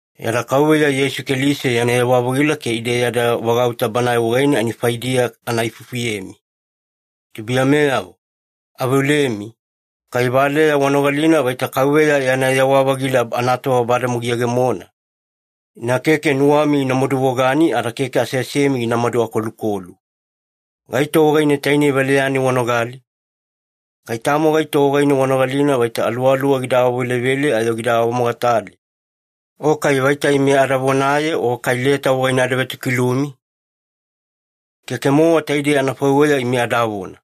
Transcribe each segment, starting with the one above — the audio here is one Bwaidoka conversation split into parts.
Yada Kauveya Yeisu Keliso yana yewa-vagila ke ide yada vagauta Banae wagaine ani faidiya ana ifufuyemi. Tubuiyameyavo, aveolemi, kai valeya wanogalina vaita Kauveya yana yewa-vagila anatova bademowa giyegemona, ina keke nuwami gina maduvogani ada keke aseasemi ginamadu akolukolu. Gaito wagaine tainei valeya-nai wanogali? Kai tamo gaito wagaine wanogalina vaita aluwaluwa gida awavelevele ayo gida awamogatale, o kai vaita ime ada vonaye o kai leta wagaine ada vetokilumi? Keke-mowa taidei anafaiweya ime adavona.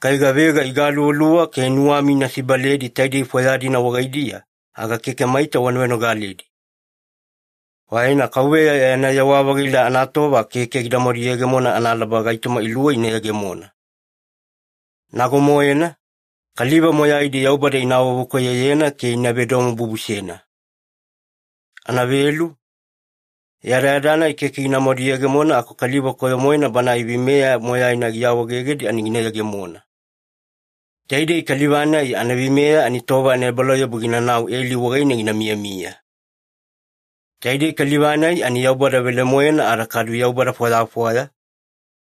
Kai gavega igaluvaluva ke nuwami ina sibaledi taidei fwaya-dina wagaidiya, aga keke maita wana venogaledi. Faina Kauveya yana yewa-vagila anatova keke ginamadu yegemona analaba gaitoma iluwei ina yegemona. Nago-moena, kaliva moyaidi Yaubada ina awavekoyoyena ke ina vedomobubusena. Anavelu, yadayada-nai keke ginamadu yegemona aku kaliva koyo-moena banae veimeya moyaina giawaegegedi ani gina yegemona. Taidei kaliva-nai anaveimeya ani tova anaebalauyabu ginanau eli wagaine gina miyamiya. Taidei kaliva-nai ani Yaubada velemoena ada kadu yaubada fwayafwaya,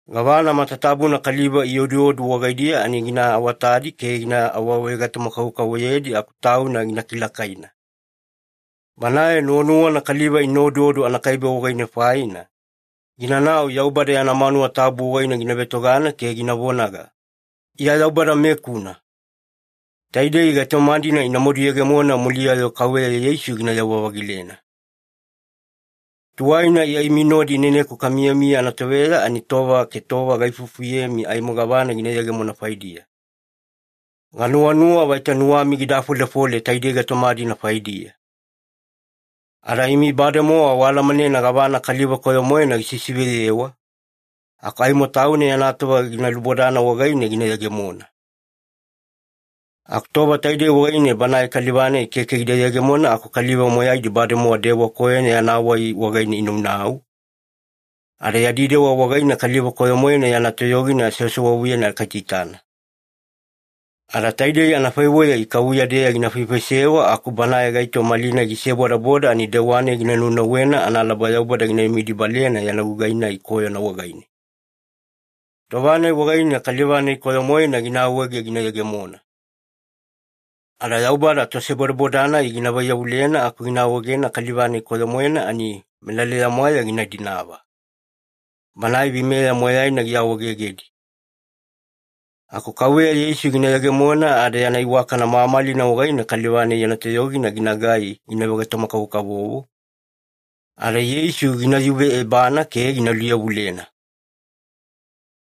gavana matatabuna kaliva ioduodu wagaidiya ani gina awatadi ke gina awavegaitoma-kavokavovoyedi aku tauna gina kilakaina. Banae nuwanuwana kaliva ina oduodu anakaibe wagaine faina, ginanau Yaubada yana manuwa tabu wagaine gina vetogana ke gina vonaga, “Iya Yaubada-mekuna.” Taidei gaitoma-dina ina maduyegemona muliya-yo Kauveya Yeisu ginayewa-vagilena. Tuwaina Iya imi nodi ineneku kamiyamiya anatoveya ani tova ke tova gaifufuyemi aimo gavana gina yegemona faidiya. Ganuwanuwa vaita nuwami gida afolefole taidei gaitoma-dina faidiya. Ada imi bademowa waalamanena gavana kaliva koyo-moena gisisiveyewa, aku aimo tauna yana tova gina lubodana wagaine gina yegemona. Aku tova taidei wagaine banae kaliva-nai keke gida yegemona aku kaliva moyaidi bademowa dewa koyona yana wai wagaine inaunau, ada yadi dewa wagaine kaliva koyo-moena yana toyogina sewasewavuyena kaitaitana. Ada taidei anafaiweya ikavuya-deya gina faifaisewa aku banae gaito malinai gisebodaboda ani dewa-nai gina naunauwena analaba Yaubada gina vemidibalena yana gugai-nai koyona wagaine. Tova-nai wagaine kaliva-nai koyo-moena gina awaege gina yegemona. Ada Yaubada tosebodaboda-nai gina vaiyavulena aku gina awaegena kaliva-nai koyo-moena ani melaleya-mwaeya gina dinava, banae veimeya moyaina giawaawaegegedi. Aku Kauveya Yeisu gina yegemona ada yana iwakana mamalina wagaine kaliva-nai yana toyogina ginagai gina vegaitoma-kavokavovo, ada Yeisu gina yuve ebana ke gina luyavulena.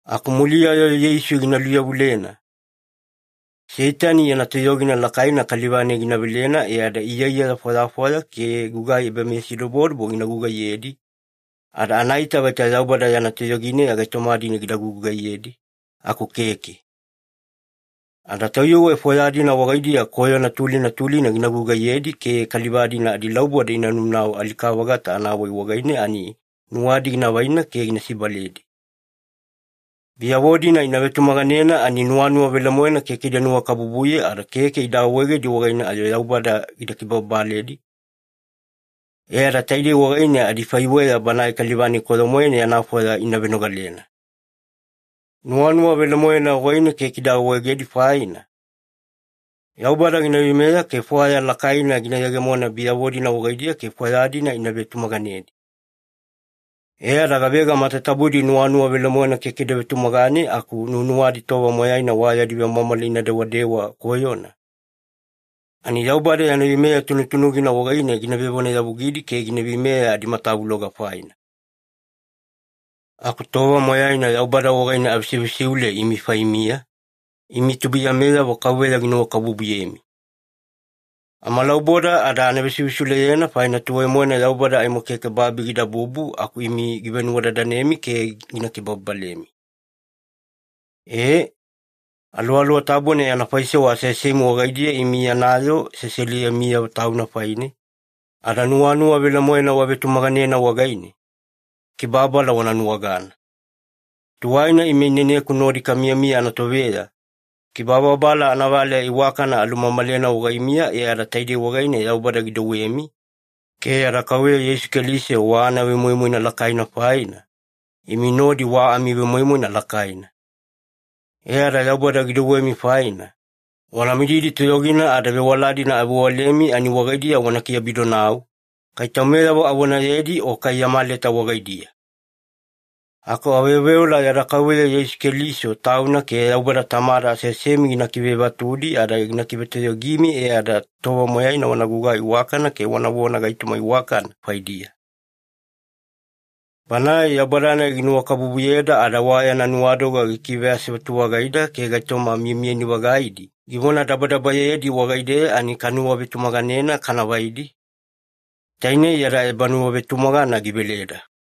Aku muliya-yo Yeisu gina luyavulena, Seitani yana toyogina lakaina kaliva-nai gina velena e ada iyaiyaya fwayafwaya ke gugai ebameyasidobodobo gina gugaiyedi, ada anaita vaita Yaubada yana toyogineya gaitoma-dina gida gugugaiyedi, aku keke. Ada tayuwe fwaya-dina wagaidiya koyona tulina tulina gina gugaiyedi ke kaliva-dina adilauboda inaunau alika-vagata anawai wagaine ani nuwadi gina vaina ke gina sibaledi. Biyavo-dina ina vetumaganena, ani nuwanuwa velemoena keke ida nuwakabubuye ada keke ida awaegedi wagaine ayo Yaubada gida kibababaledi, e ada taidei wagaine adifaiweya banae kaliva-nai koyo-moena yana fwaya ina venogalena. Nuwanuwa velemoena wagaine keke ida awaegedi faina, Yaubada gina veimeya ke fwaya lakaina gina yegemona biyavo-dina wagaidiya ke fwaya-dina ida vetumaganedi. E ada gavega matatabudi nuwanuwa velemoena keke ida vetumagane aku nuwanuwadi tova moyaina wa yadi vemwamwala ina dewadewa koyona, ani Yaubada yana veimeya tunutunugina wagaine gina vevonayavugidi ke gina veimeya adimatavuloga faina. Aku tova moyaina Yaubada wagaine avesivesiule imi faimiya, imi tubuiyameyavo Kauveya ginuwakabubuyemi. Amalauboda ada vesivesiuleyena faina tuwai-moena Yaubada aimo keke babi gidabubu aku imi givenuwadadanemi ke gina kibababalemi. E, Aluwaluwa Tabuna yana faisewa aseasemi wagaidiya imi yana yoo seseliyemiyavo Tauna faine, ada nuwanuwa velemoena wavetumaganena wagaine, kibababala wana nuwagana. Tuwaina ime ineneku nodi kamiyamiya anatoveya, kibababala anavaleya iwakana alumamalena wagaimiya e ada taidei wagaine Yaubada gidouwemi ke yada Kauveya Yeisu Keliso wa anavemoimoina lakaina faina, imi nodi wa amivemoimoina lakaina. E ada Yaubada gidouwemi faina, wana mididi toyogina ada vewala-dina avewalemi ani wagaidiya wana kiabidonau, kai taumeyavo avonayedi o kai yama leta wagaidiya. Aku aveoveola yada Kauveya Yeisu Keliso Tauna ke Yaubada Tamada aseasemi ina kivevatudi ada ina kivetoyogimi, e ada tova moyaina wana gugai iwakana ke wanavona gaitoma iwakana faidiya. Banae Yaubada-nai ginuwakabubuyeda, ada wa yana nuwadoga gikiveasevatu-vagaida ke gaitoma miyamiyani-vagaidi givonadabadabayedi wagaideya ani kanuwavetumaganena kana vaidi, tainei yada ebanuwavetumagana giveleda.